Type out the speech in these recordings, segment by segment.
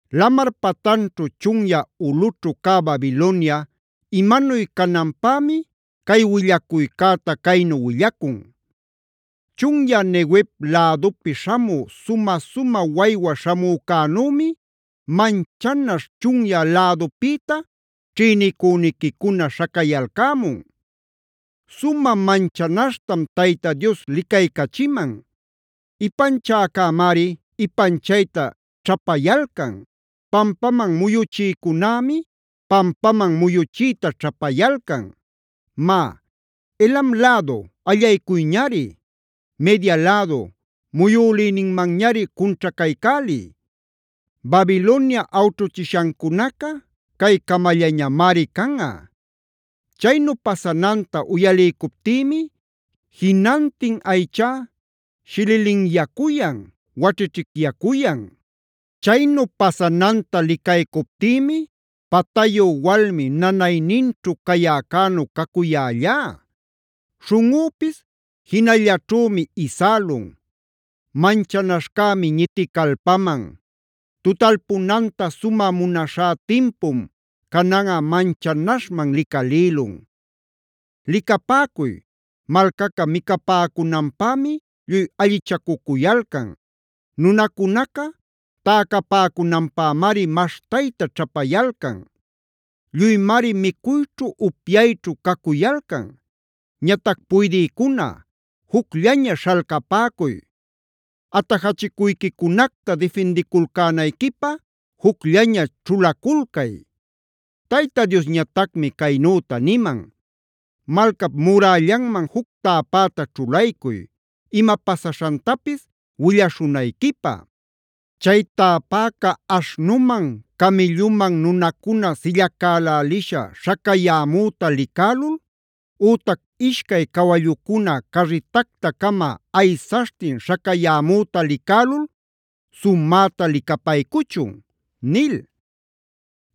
Lamar patanćhu chunyä ulꞌućhu cä Babilonia imanuy cananpämi, cay willacuycäta caynu willacun: Chunyä Neguev lädupi śhamü sumä-sumä waywa śhamücänümi, manchanaśh chunyä lädupïta ćhïnicüniquicuna śhacayalcämun. Sumä manchanaśhtam Tayta Dios licaycachiman. Ipanchäcämari ipanchayta ćhapayalcan; pampaman muyuchïcunämi pampaman muyuchiyta ćhapayalcan. Má, ¡Elam lädu, allaycuyñari! ¡Media lädu, muyülïninmanñari cunćhacaycäliy! Babilonia awćhuchishancunaca cay camallañamari canꞌa. Chaynu pasananta uyaliycuptïmi jinantin aychá shililinyacuyan, waćhićhicyacuyan; chaynu pasananta licaycuptïmi patayu walmi nanayninćhu cayäcänu cacuyällá. Śhunꞌüpis jinallaćhümi isälun; manchanaśhcämi ñiticalpaman. Tutalpunanta sumä munaśhá timpum, cananꞌa manchanaśhman licalïlun. Licapäcuy, malcaca micapäcunanpämi lluy allichacucuyalcan; nunacunaca täcapäcunanpämari maśhtayta ćhapayalcan. Lluymari micuyćhu, upyayćhu cacuyalcan. Ñatac puydïcuna, ¡jucllaña śhalcapäcuy! ¡Atajachicuyquicunacta difindiculcänayquipä jucllaña ćhulaculcay! Tayta Diosñatacmi caynüta niman: “Malcap murällanman juc täpäta ćhulaycuy ima pasaśhantapis willaśhunayquipä. Chay täpäca aśhnuman, camïlluman nunacuna sillacälälisha śhacayämüta licälul ütac ishcay cawallucuna carritacta-cama aysaśhtin śhacayämüta licälul, sumäta licapaycuchun” nil.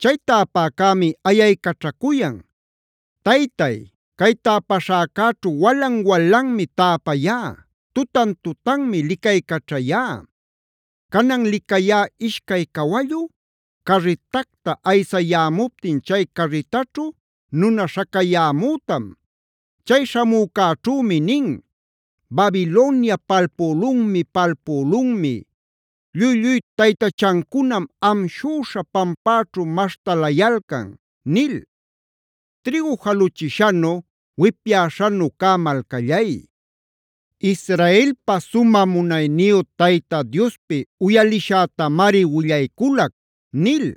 Chay täpäcämi ayaycaćhacuyan: “Taytay, cay täpäśhäcäćhu walan-walanmi täpayá; tutan-tutanmi licaycaćhayá. Canan licayá ishcay cawallu carritacta aysayämuptin chay carritaćhu nuna śhacayämütam. Chay śhamücäćhümi nin: ‘¡Babilonia palpülunmi, palpülunmi!a ¡Lluy-lluy taytachancunam amshüśha pampäćhu maśhtalayalcan!’ nil. “Trïgu jalüchishanu, wipyäśhanu cä malcallay, Israelpa sumä munayniyu Tayta Diospi uyalishätamari willayculac” nil.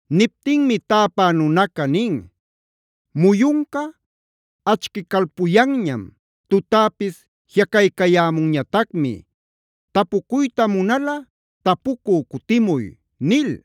Niptinmi täpä nunaca nin: “Muyunca achquicalpuyanñam; tutäpis jiꞌacaycayämunñatacmi. Tapucuyta munalꞌa, tapucü cutimuy” nil.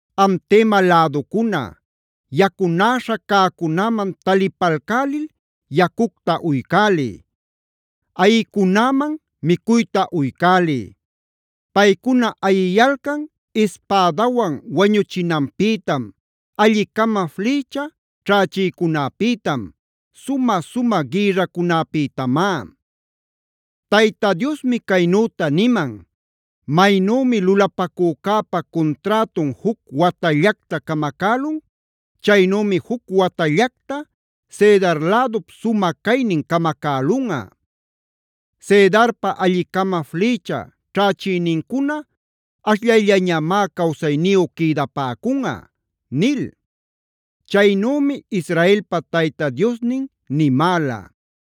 Am Tema läducuna, yacunäśha cäcunäman talipalcälil yacucta uycäliy; ayïcunäman micuyta uycäliy. Paycuna ayiyalcan ispädawan wañuchinanpïtam, alli-cama flïcha ćhächïcunäpïtam, sumä-sumä gïrracunapïtamá. Tayta Diosmi caynüta niman: “Maynümi lulapacücäpa cunträtun juc watallacta camacälun, chaynümi juc watallacta Cedar lädup sumä caynin camacälunꞌa. Cedarpa alli-cama flïcha ćhächïnincuna ashllayllañamá cawsayniyu quïdapäcunꞌa” nil. Chaynümi Israelpa Tayta Diosnin nimäla.